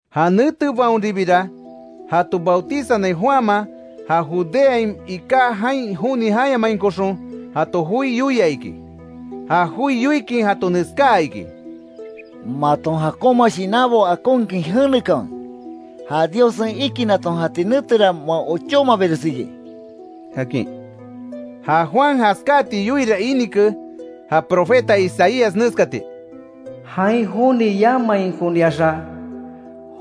Ja netebaonribira jato bautizanai Juanman ja Judeain iká jain joni jayamainkoxon jato joi yoia iki. Ja joi yoikin jato neskaa iki: “¡Maton jakonma shinanbo akonkin jenekanwe, ja Diossen ikinaton jati netera, moa ochómabires iki!” akin. Ja Juan jaskáti yoiira inike ja profeta Isaías neskati: “Jain joni jayamainkoniaxa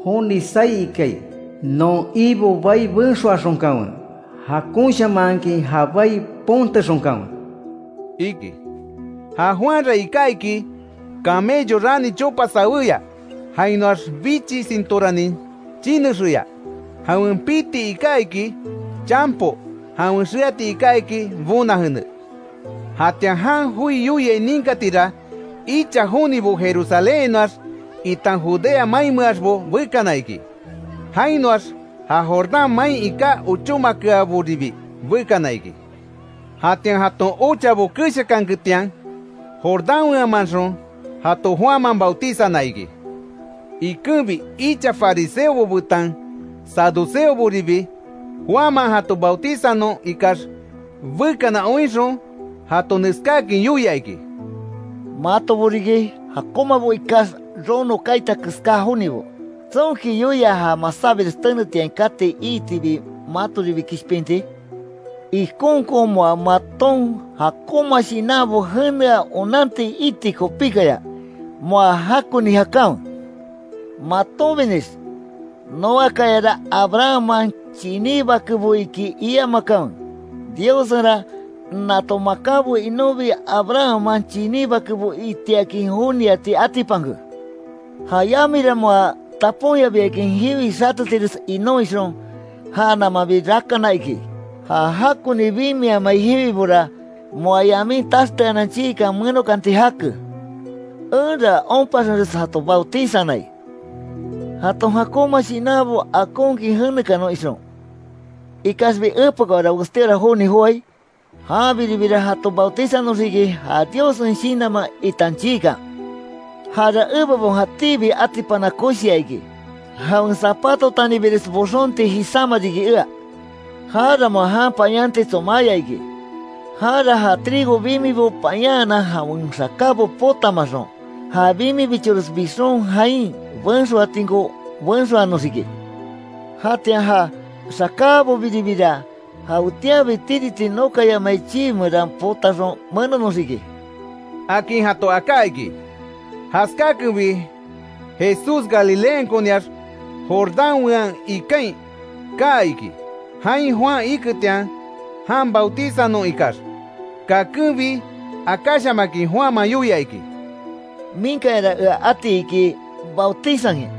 joni saí ikai: ‘Non Ibo bai benxoaxonkanwe; jakonshamanhakin ja bai pontexonkanwe’”, iki. Ja Juanra iká iki, camello rani chopa sawéya. Jainoax bichi sintóranin chinexeya. Jawen piti iká iki, chanpo, jawen xeati iká iki, bona jene. Jatian jan joi yoiai ninkatira, icha jonibo Jerusalénhainoax, itan Judea mainmeaxbo bekana iki. Jainoax ja Jordán main iká ochómakeaboribi bekana iki. Jatian, jaton ochabo keshakanketian, Jordán weanmanxon, jato Juanman bautizana iki. Ikenbi icha fariseobo betan saduceoboribi, Juanman jato bautizanon ikax bekana oinxon, jato neskáakin yoia iki: “Matobo riki, jakonmabo ikax, rono kaita keská jonibo. ¿Tsonki yoia ja masábires tenetiain kati iitibi matoribi kishpinti? Ikonkon moa maton jakonma shinanbo jenea onanti iti kopíkaya, moa jakoni jakanwe. Matonbinix: ‘Noakayara Abrahamman chiní bakebo iki’, iamakanwe, Diossenra nato makanbo inonbi Abrahamman chiní bakebo itiakin joniati atipanke. Ja yamira moa taponyabiakin jiwi xatetires inon ixon, ja namanbi rakana iki. Ja jakoni bimiamai jiwibora, moa yamin taxteanan chiikan menokanti jake. Enra onpaxenres jato bautizanai, jaton jakonma shinanbo akonkin jenekanon ixon. Ikaxbi epekaora westíora joni joai, janbiribira jato bautizanoxiki, ja Diossen Shinanman, itan chiikan. Jara ebebon jatíbi atipana koshia iki, jawen zapatotanibires boxonti jisáma riki ea. Jara moa jan payanti tsomáya iki. Janra ja trigo bimibo payanhanan jawen xakábo potamaxon, ja bimibichores bixon, jain benxoatinko benxoanoxiki. Jatian ja xakábobiribira, jawetianbi tiriti nokayamai chii meran potaxon menonoxiki”, akin jato aká iki. Jaskákenbi Jesús Galileankoniax Jordán wean ikain kaa iki, jain Juan iketian, jan bautizanon ikax. Kakenbi akáshamakin Juanman yoia iki: —Minkayara ea ati iki bautizankin;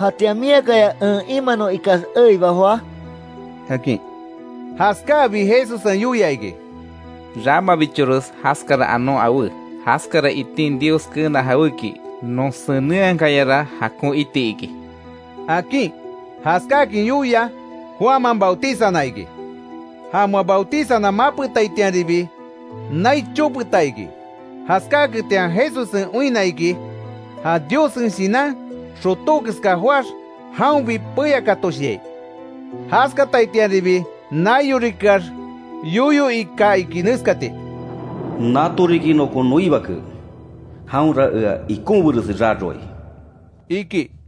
¿Jatian miakaya en imanon ikax eiba joá? —akin. Jaskáabi, Jesussen yoia iki: —Ramabichores jaskara anon awé, jaskara itin Dios keena jawéki, non senenhakayara jakon iti iki —akin. Jaskáakin yoia, Juanman bautizana iki. Ja moa bautizana mapetaitianribi, nai chopeta iki. Jaskaketian Jesussen oinna iki, ja Diossen Shinan, xotó keska joáx jaonbi peyakatoshiai. Jaskataitianribi, naiorikeax yoyo ika iki neskati: “Nato riki nokon noi bake, jaonra ea ikonbiresi raroai”, iki.